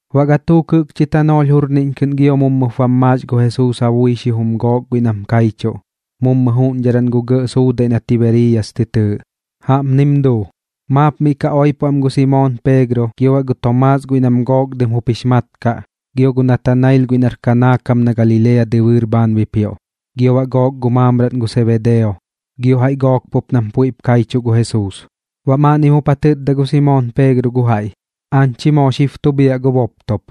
Baꞌ gatuuk jɨꞌkchi tanoolh jurniꞌñ kɨꞌn gio mummɨp bam maax gu Jesuus ja bui xijum gook guiꞌ nam kaichuꞌ, mummu juꞌñdharan gu gɇꞌ suudaiꞌ na Tibeeriyas tɨ tɨɨꞌ. Jaꞌpnim duu. Maap miꞌ ka oipo am gu Simoon Peegro, gio baꞌ gu Tomaas guiꞌ nam Gook Dɨm jup jix mat kaꞌ, gio gu Natanail guiꞌ nar Kanaa kam na Galilea dɨbɨɨr bhaan bipioꞌ, gio baꞌ gook gu maamraꞌn gu Sebedeo, gio jaiꞌ gook pup nam puiꞌp kaichuꞌ gu Jesuus. Baꞌ maaꞌnnim jup ja tɨtda gu Simoon Peegro gu jaiꞌ: ―Aañ chi moo xib tu bhiaꞌ gu boptop.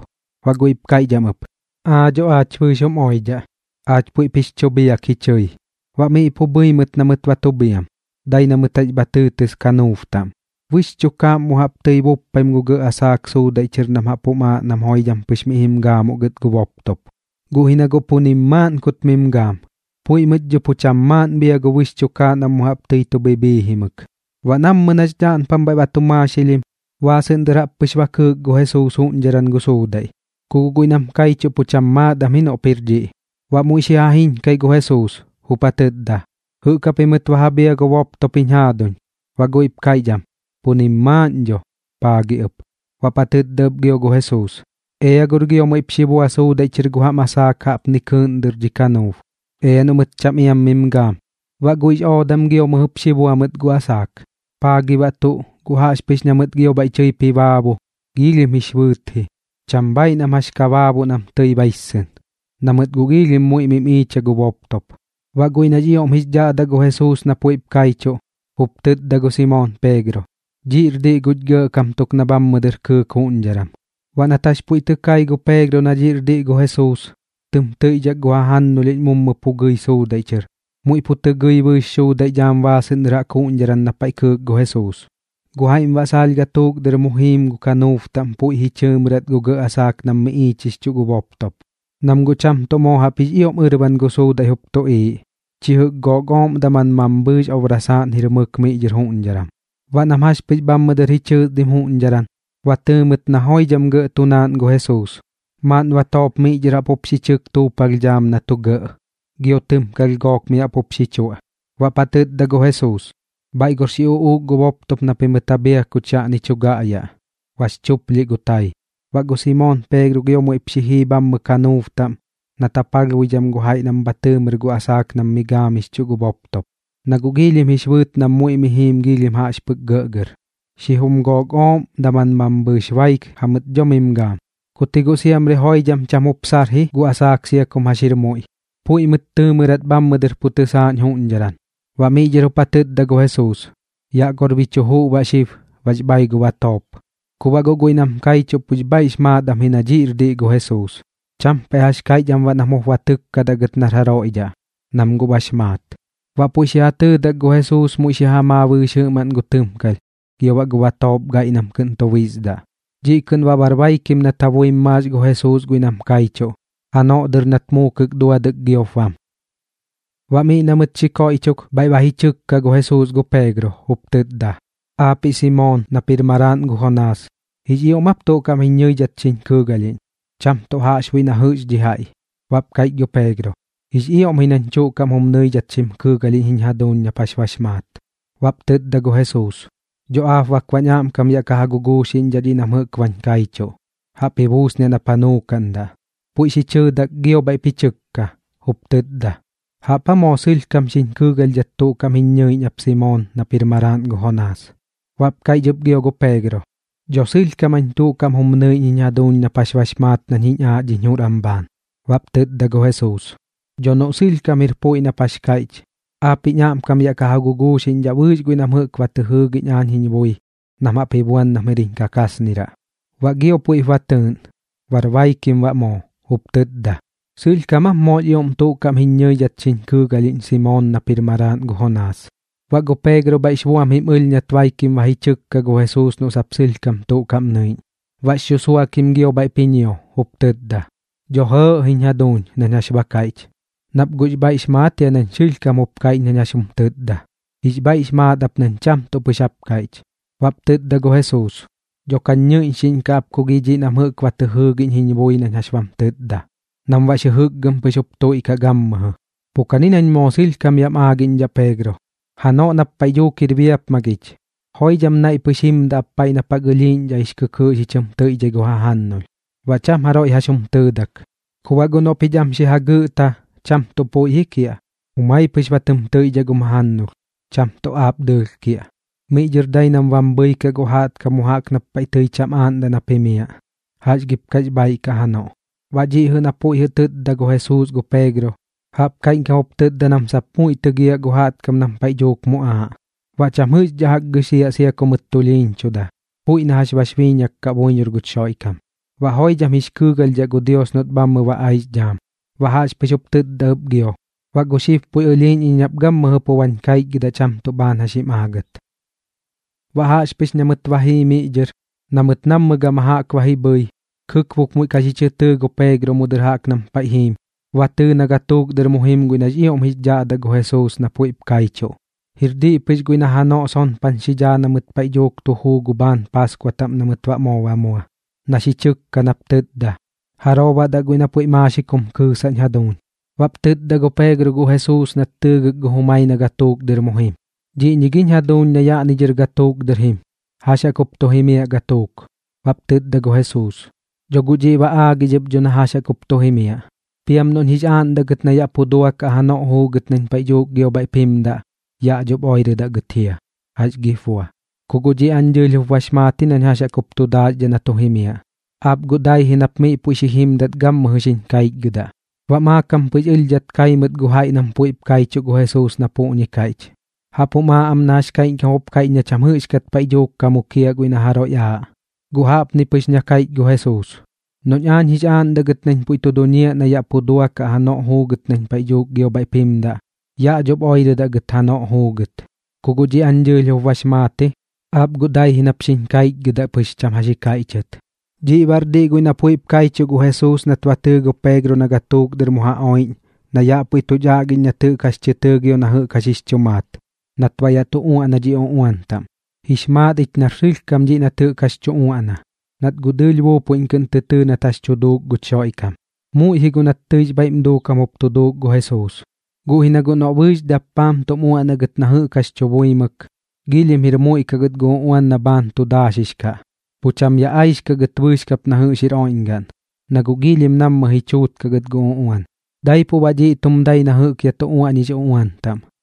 Baꞌ guiꞌp kaiꞌch am ɨp: ―Aa dho aach bɨɨx jum oidhaꞌ. Aach puiꞌp jix chu bhiak ji chɨi. Baꞌ miꞌ pu bhɨi mɨt na mɨt ba tu bhiam, dai na mɨt jax bha tɨɨtɨs kanuub taꞌm. Bɨx chukaaꞌm mu jaꞌp tɨi buppaim gu gɇꞌ asaak suudaiꞌ chɨr nam jaꞌp jum aaꞌ nam joidham pɨx miꞌ jim gaamuꞌ gɨt gu boptop. Guꞌ ji na guꞌ pu nim maaꞌn kut mim gaam, puiꞌ mɨt dho pu cham maaꞌn bhia gu bɨx chukaaꞌ nam mu jaꞌp tɨi chu bhibhiijimɨk. Baꞌ nammɨ nax dhaꞌnpam bhaiꞌ ba tu maaxilhim, baasɨꞌn dɨr jaꞌp pɨx ba kɨɨk gu Jesuus juꞌñdharan gu suudaiꞌ, ku guꞌ guiꞌ nam kaichuꞌ pu cham maat am ji noꞌp jir dhiꞌ. Baꞌ muiꞌ xi ja jiñkai gu Jesuus, jup ja tɨtda: ―¿Jɨꞌk japimɨt ba ja bhia gu boptop jiñ jaaduñ? Baꞌ guiꞌp kaiꞌch am: ―Pu nim maaꞌn dho. ¿Paa gi ɨp? Baꞌp ja tɨtda ɨp gio gu Jesuus: ―Ea gor gio muiꞌp xi bua suudaiꞌ chɨr gu jam asaak jaꞌpni dhɨr jaꞌk kɨɨꞌn dɨr dhi kanuub, ea noꞌ mɨt cham iam mim gaam. Baꞌ guiꞌx oodam gio mɨjɨp xi bua mɨt gu asaak, paa gi baꞌ tuꞌ. Gu jaꞌxpɨx na mɨt gio bhaiꞌ tɨip ji baabu, giilhim jix bɨɨt ji, cham bhaaiꞌ nam jax ka baabuꞌ nam tɨi baissɨn, na mɨt guꞌ giilhim muiꞌ mim iicha gu boptop. Baꞌ guiꞌ nax ioꞌm jix dhaꞌdaꞌ gu Jesuus na puiꞌp kaichuꞌ, jup tɨtda gu Simoon Peegro: ―Dhiꞌr diꞌ guch Gɇꞌkam tuk na bhammɨ dɨr kɨɨk juꞌñdharan. Baꞌ nat jax puiꞌ tɨ kai gu Peegro na dhiꞌr diꞌ gu Jesuus, tɨm tɨiꞌdhak gu jajannulhiꞌñ mummu pu gɨi suudaiꞌ chɨr, muiꞌ pu tɨ gɨi bɨɨx suudaiꞌ dhaam baasɨꞌn dɨr jaꞌk juꞌñdharan na paiꞌ kɨɨk gu Jesuus. Guꞌ jaiꞌm baꞌ saalh gatuuk dɨr mu jiim gu kanuub taꞌm puiꞌ ji chɨɨmɨrat gu gɇꞌ asaak nam mi iichixchuꞌ gu boptop, nam guꞌ cham tuꞌ moo jaꞌp jix ioꞌm ɨrban gu suudaiꞌ jup tuꞌiiꞌ, chi jɨꞌk gook ooꞌm daman mambhɨɨx obrasaaꞌn jir mɨk miꞌ dhɨr juꞌñdharan. Baꞌ nam jax pɨx bhammɨ dɨr ji chɨɨsdim juꞌñdharan, ba tɨɨ mɨt na joidham gɇꞌ tu naaꞌn gu Jesuus, maaꞌn batoop miꞌ dhɨr jaꞌp jup xi chɨk tuupalh dhaam na tu gɇꞌ, gio tɨmkalh gook mi jaꞌp jup xi chuaꞌ. Baꞌp ja tɨtda gu Jesuus: ―Bhaiꞌ gor xi uꞌuuk gu boptop na pimɨt ja bhia kuch yaꞌni tu gaꞌyaꞌ. Bax chuplhiꞌ gu tai. Baꞌ gu Simoon Peegro gio muiꞌp xi jii bhammɨ kanuub taꞌm nat ja palhbuidham gu jaiꞌ nam bha tɨɨmɨr gu asaak nam mi gaamixchuꞌ gu boptop, na guꞌ giilhim jix bɨɨt nam muiꞌ miꞌ jiim giilhim jaꞌx pɨk gɇꞌgɇr, xijum gook ooꞌm daman mambhɨɨx baik jamɨt dho mim gaam. Kut ji guꞌ siamri joidham cham jup sar ji gu asaak sia kum jax jir muiꞌ, puiꞌ mɨt tɨɨmɨrat bhammɨ dɨr pu tɨsaaꞌñ juꞌñdharan. Baꞌ miꞌ dhɨr jup ja tɨtda gu Jesuus: ―Yaꞌ gor bi chu juꞌ baꞌ xib. Bax bai gu batoop. Ku baꞌ guꞌ guiꞌ nam kaichuꞌ pux bhaiꞌx maat am ji na dhiꞌr diꞌ gu Jesuus. Cham paiꞌ jax kaiꞌch am baꞌ nam jup ba tɨkkadaꞌ gɨt nar jaroiꞌ dhaꞌ, nam guꞌ bax maat. Baꞌ puiꞌ xi ja tɨɨdak gu Jesuus muiꞌ xi ja maa bɨɨx jɨꞌmaꞌn gu tɨmkalh gio baꞌ gu batoop gaiꞌ nam kɨꞌn tu bisdaꞌ. Dhiꞌ kɨꞌn baꞌ bar baikim nat ja buim maax gu Jesuus guiꞌ nam kaichuꞌ janoꞌ dɨr nat muukɨk duadɨk giop bam. Baꞌ miꞌ na mɨt xi koiꞌchok, bhaiꞌ ba tɨkka gu Jesuus gu Peegro, jup tɨtda: ―Aapiꞌ Simoon nap jir maraaꞌn gu Jonaas, ¿jix ioꞌm aap tuꞌ kaꞌm jiñ ñɨidhat xiñ kɨɨgalhiꞌñ, cham tuꞌ jaꞌxbuiꞌ na jɨꞌx dhi jaiꞌ? Baꞌp kaiꞌch gu Peegro: ―Jix ioꞌm ji nañ tuꞌ kaꞌm jum nɨidhat xim kɨɨgalhiꞌñ jiñ jaduuñ nap jax bax maat. Baꞌp tɨtda gu Jesuus: ―Dho aap bak baꞌñ aꞌmkam yaꞌ ka ja guguuxiꞌñdhaꞌ dhiꞌ nam jɨꞌk bañ kaichuꞌ. Jaꞌp ji buusniaꞌ nap ja nuukaꞌndaꞌ. Puiꞌ xi chɨɨdak gio bhaiꞌp ji chɨkka, jup tɨtda: ―¿Jaꞌp aa moo sɨlhkam xiñ kɨɨgalhdhat tuꞌ kaꞌm jiñ ñɨiꞌñ ap Simoon nap jir maraaꞌn gu Jonaas? Baꞌp kaiꞌch ɨp gio gu Peegro: ―Dho sɨlhkam jañ tuꞌ kaꞌm jum nɨiꞌñ jiñ jaduuñ nap jax bax maat nañ jiñ aaꞌ dhiñ jur am bhaan. Baꞌp tɨtda gu Jesuus: ―Dho noꞌ sɨlhkam jir puiꞌ nap jax kaiꞌch, aap jiñ aꞌmkam yaꞌ ka ja guguuxiꞌñdhaꞌ bɨɨx guiꞌ nam jɨꞌk ba tɨ jɨɨgiꞌñ aañ jiñ bui nam jaꞌp ji buan nam jir jiñ kakasniraꞌ. Baꞌ gio puiꞌp ba tɨɨꞌn, bar baikim baꞌ moo, jup tɨtda: ―¿Sɨlhkam aap moox ioꞌm tuꞌ kaꞌm jiñ ñɨidhat xiñ kɨɨgalhiꞌñ Simoon nap jir maraaꞌn gu Jonaas? Baꞌ gu Peegro bhaiꞌx buam jim ɨlh nat baikim ba ji chɨkka gu Jesuus noꞌ sap sɨlhkam tuꞌ kaꞌm nɨiꞌñ. Baꞌx xusuakim gio bhaiꞌp ji ñio, jup tɨtda: ―Dho jɨɨꞌ jiñ jaduuñ nañ jax ba kaiꞌch, nap guꞌx bhaiꞌx maat jia nañ sɨlhkam jup kaiꞌch nañ jax jum tɨtda. Jix bhaiꞌx maat ap nañ cham tuꞌ pɨx jap kaiꞌch. Baꞌp tɨtda gu Jesuus: ―Dhop kañ ñɨiꞌñxiꞌñkaꞌ ap ku gi dhiꞌ nam jɨꞌk ba tɨ jɨɨgiꞌñ jiñ bui nañ jax bam tɨtda, nam baꞌx jɨjɨkgɨm pɨx jup tuiꞌkaꞌ gammɨjɨ. Pu kani nañ moo sɨlhkam yaꞌm aagiꞌñdhaꞌ Peegro, janoꞌ nap paiꞌ dhuuk jir biapmagich, joidham naiꞌ pɨx jimdaꞌ ap paiꞌ nap jaꞌk ɨlhiiꞌñdhaꞌ jix kɨkɨɨꞌ xi chɨm tɨiꞌdhai gu jajannulh, baꞌ cham jaroiꞌ jax jum tɨɨdak. Ku baꞌ guꞌ noꞌ pich am xi jagɨꞌta, cham tuꞌ puiꞌ ji kiaꞌ, jumai pɨx ba tɨm tɨiꞌdhaꞌ gum jajannulh, cham tuꞌ aap dɨɨlh kiaꞌ. Miꞌ dhɨr dai nam bam bhɨikaꞌ gu jaꞌtkam mu jaꞌk nap paiꞌ tɨi cham aaꞌndaꞌ nap jimiaꞌ. ¿Jax gip kax bhaaiꞌ kaꞌ janoꞌ? Baꞌ dhiꞌ na puiꞌ jɨꞌ tɨtda gu Jesuus gu Peegro, jaꞌp kaiꞌñkam jup tɨtda nam sap muiꞌ tɨgiaꞌ gu jaꞌtkam nam paiꞌ dhuuk muꞌaaꞌ, baꞌ cham jɨꞌxdhaꞌ jaꞌk gɨxiaꞌ sia ku mɨt tulhiiñchuda, puiꞌ na jax bax biiñak kaꞌ buiñor guch Xoiꞌkam, baꞌ joidham jix kɨɨgalhdhaꞌ gu Dios noꞌt bhammɨ ba aix dhaam. Baꞌ jaꞌxpɨx jup tɨtda ɨp gio: ―Baꞌ gu xib puiꞌ ɨlhiiꞌñ iñ nap gammɨjɨ pu bañ kaichgɨdaꞌ cham tuꞌ bhaan jax jim aagat. Baꞌ jaꞌxpɨx na mɨt ba jii miꞌ dhɨr na mɨt nammɨ gama jaꞌk ba ji bhɨi, kɨkbuk muiꞌ ka xi chɨ tɨɨ gu Peegro mu dɨr jaꞌk nam paiꞌ jiim, ba tɨɨ na gatuuk dɨr mu jim guiꞌ nax ioꞌm jix dhaꞌdaꞌ gu Jesuus na puiꞌp kaichuꞌ, jir diꞌ pɨx guiꞌ na janoꞌ sonpan xi dhaa na mɨt paiꞌ dhuuk tu juu gu bhaan Paaskua taꞌm na mɨt baꞌ moo ba mua, na xi chɨkka nap tɨtda: “¿Jaroo baꞌ daꞌ guiꞌ na puiꞌ maaxik jum kɨɨsaꞌñ jaduuñ?” Baꞌp tɨtda gu Peegro gu Jesuus nat tɨɨgɨk gu jumai na gatuuk dɨr mu jim: ―¿Dhiꞌñi giñ jaduuñ na yaꞌni dhɨr gatuuk dɨr jim, jax jaꞌk jup tu jimiaꞌ gatuuk? Baꞌp tɨtda gu Jesuus: ―Dho guꞌ dhiꞌ ba aagix ɨp dho na jax jaꞌk jup tu jimiaꞌ. Piam noꞌñ jix aaꞌndaꞌ gɨt na yaꞌ pu duakaꞌ janoꞌ juugɨt nañ paiꞌ dhuuk gio bhaiꞌp jimdaꞌ, yaꞌ dhop oirɨdaꞌ gɨt jia, ¿jax gip bua? Ku guꞌ dhiꞌ aañ dɨɨlh jup bax maat nañ jax jaꞌk jup tu daaxdhaꞌ na tu jimiaꞌ. Aap guꞌ dai ji nap miꞌ puiꞌ xi jimdat gammɨjɨ xiñ kaichgɨdaꞌ. Baꞌ maakam pɨx ɨlhdhat kai mɨt gu jaiꞌ nam puiꞌp kaichuꞌ gu Jesuus na puꞌñi kaiꞌch, jaꞌp jum aaꞌ am na jax kaiꞌñkam jup kaiꞌch na cham jɨꞌxkat paiꞌ dhuuk ka mukiaꞌ guiꞌ na jaroiꞌ aaꞌ. Guꞌ jaꞌpjani pɨx na kaiꞌch gu Jesuus: “Noꞌñ aañ jix aaꞌndaꞌ gɨt nañ puiꞌ tu duñiaꞌ na yaꞌ pu duakaꞌ janoꞌ juugɨt nañ paiꞌ dhuuk gio bhaiꞌp jimdaꞌ, yaꞌ dhop oirɨdaꞌ gɨt janoꞌ juugɨt. Ku guꞌ dhiꞌ aañ dɨɨlh jup bax maat ji. Aap guꞌ dai ji nap xiñ kaichgɨdaꞌ pɨx cham jax ji kaiꞌchɨt.” Dhiꞌ baꞌr diꞌ guiꞌ na puiꞌp kaichuꞌ gu Jesuus nat ba tɨɨ gu Peegro na gatuuk dɨr mu ja oiꞌñ, na yaꞌ puiꞌ tuch aꞌgiꞌñ nat jɨꞌk jax tɨ tɨɨ gio na jɨꞌk jax jix chu maat, nat baꞌ yaꞌ tu uaꞌna dhi uꞌuan taꞌm. Jix maat ich nar sɨlhkam dhiꞌ nat jɨꞌk jax tu uaꞌna, nat guꞌ dɨɨlh buupuiꞌñ kɨꞌn tɨ tɨɨ nat jax tu duuk guch Xoiꞌkam. Muiꞌ ji guꞌ nat tɨix bhaiꞌm duukam jup tu duuk gu Jesuus, guꞌ ji na guꞌ noꞌ bɨɨx dappaam tum uaꞌnaꞌ gɨt na jɨꞌk jax tu buimɨk, jir muiꞌ kaꞌ gɨt gu uꞌuan na bhaan tu daaxix kaꞌ, pu cham yaꞌ aixkaꞌ gɨt bɨɨx kap na jɨꞌx jir oiꞌñgaꞌn, na guꞌ nammɨ ji chuutkaꞌ gɨt gu uꞌuan. Daipuꞌ baꞌ dhiꞌ tum dai na jɨꞌk yaꞌ tu uaꞌñix uꞌuan taꞌm.